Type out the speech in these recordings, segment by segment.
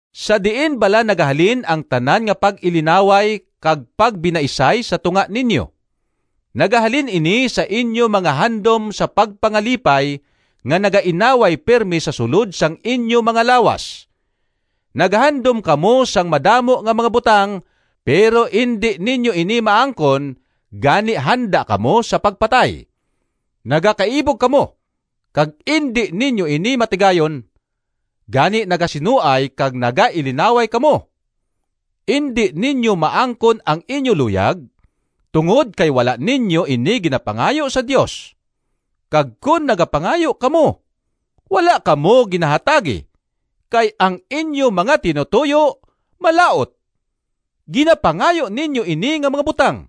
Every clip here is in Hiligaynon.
Sa diin bala nagahalin ang tanan nga pag-ilinaway kag pagbinaisay sa tunga ninyo? Nagahalin ini sa inyo mga handom sa pagpangalipay, nga nagainaway pirme sa sulod sang inyo mga lawas. Nagahandom kamo sang madamo nga mga butang, pero indi ninyo ini maangkon, gani handa kamo sa pagpatay. Nagakaibog kamo, kag indi ninyo ini matigayon, gani nagasinuay kag nagailinaway kamo. Indi ninyo maangkon ang inyo luyag, tungod kay wala ninyo ini ginapangayo sa Dios. Kag kon nagapangayo kamo, wala kamo ginahatagi, kay ang inyo mga tinutoyo malaut. Ginapangayo ninyo ini nga mga butang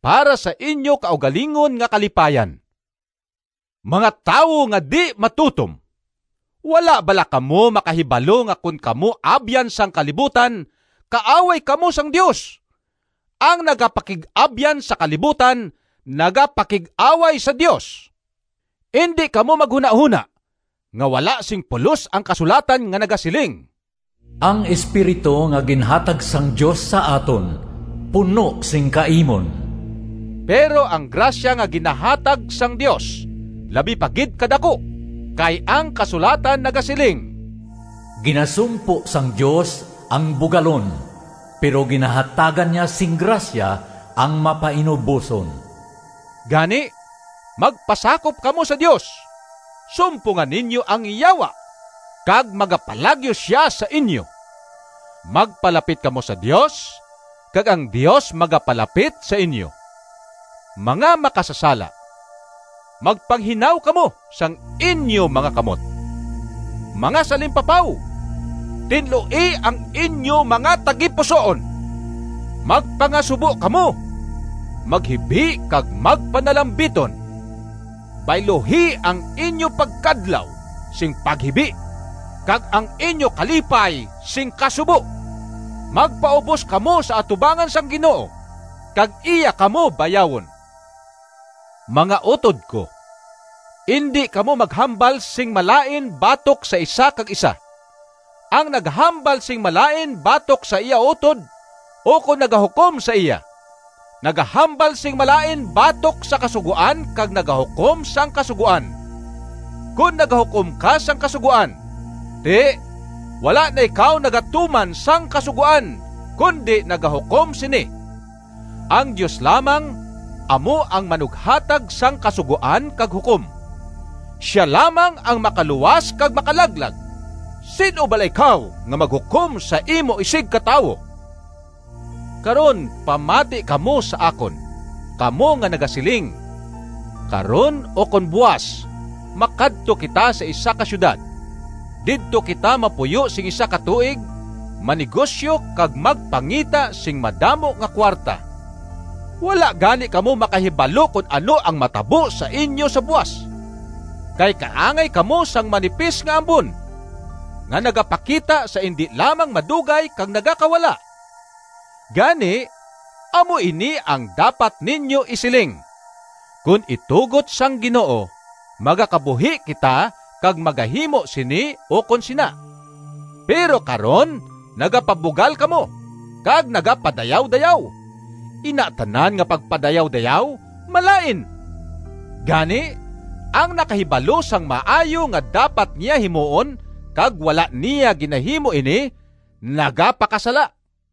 para sa inyo kaugalingon nga kalipayan. Mga tawo nga di-matutom! Wala bala kamo makahibalo nga kon kamo abyan sang kalibutan kaaway kamo sang Dios? Ang nagapakig-abyan sa kalibutan nagapakig-away sa Dios. Indi kamo maghunahona nga wala sing pulos ang kasulatan nga nagasiling, “Ang espiritu nga ginhatag sang Dios sa aton puno sing kaimon.” Pero ang grasya nga ginahatag sang Dios labi pa gid kadaku. Kay ang kasulatan nagasiling, “Ginasumpo sang Dios ang bugalon, pero ginahatagan niya sing grasya ang mapainuboson.” Gani magpasakop kamo sa Dios. Sumponga ninyo ang Yawa, kag magapalagyo sia sa inyo. Magpalapit kamo sa Dios, kag ang Dios magapalapit sa inyo. Mga makasasala, magpanghinaw kamo sang inyo mga kamot! Mga salimpapaw, tinloi ang inyo mga tagipusoon! Magpangasubo kamo, maghibi kag magpanalambiton. Bayluhi ang inyo pagkadlaw sing paghibi, kag ang inyo kalipay sing kasubo! Magpaubos kamo sa atubangan sang Ginoo, kag iya kamo bayawon. Mga utod ko, indi kamo maghambal sing malain batok sa isa kag isa. Ang nagahambal sing malain batok sa iya utod ukon nagahukom sa iya, nagahambal sing malain batok sa Kasugoan kag nagahukom sang Kasugoan. Kon nagahukom ka sang Kasugoan, ti wala na ikaw nagatuman sang Kasugoan, kundi nagahukom sini. Ang Dios lamang amo ang manughatag sang kasugoan kag hukom. Sia lamang ang makaluwas kag makalaglag. Sin-o bala ikaw nga maghukom sa imo isigkatawo? Karon pamati kamo sa akon, kamo nga nagasiling, “Karon ukon buas magakadto kita sa isa ka siyudad. Didto kita mapuyo sing isa ka tuig, manegosyo kag magpangita sing madamo nga kuwarta.” Wala gani kamo makahibalo kon ano ang matabo sa inyo sa buas! Kay kaangay kamo sang manipis nga ambon, nga nagapakita sa indi lamang madugay kag nagakawala. Gani amo ini ang dapat ninyo isiling, “Kon itugot sang Ginoo, magakabuhi kita kag magahimo sini ukon sina.” Pero karon nagapabugal kamo, kag nagapadayawdayaw. Ina tanan nga pagpadayawdayaw malain. Gani, ang nakahibalo sang maayo nga dapat niya himuon kag wala niya ginahimo ini nagapakasala.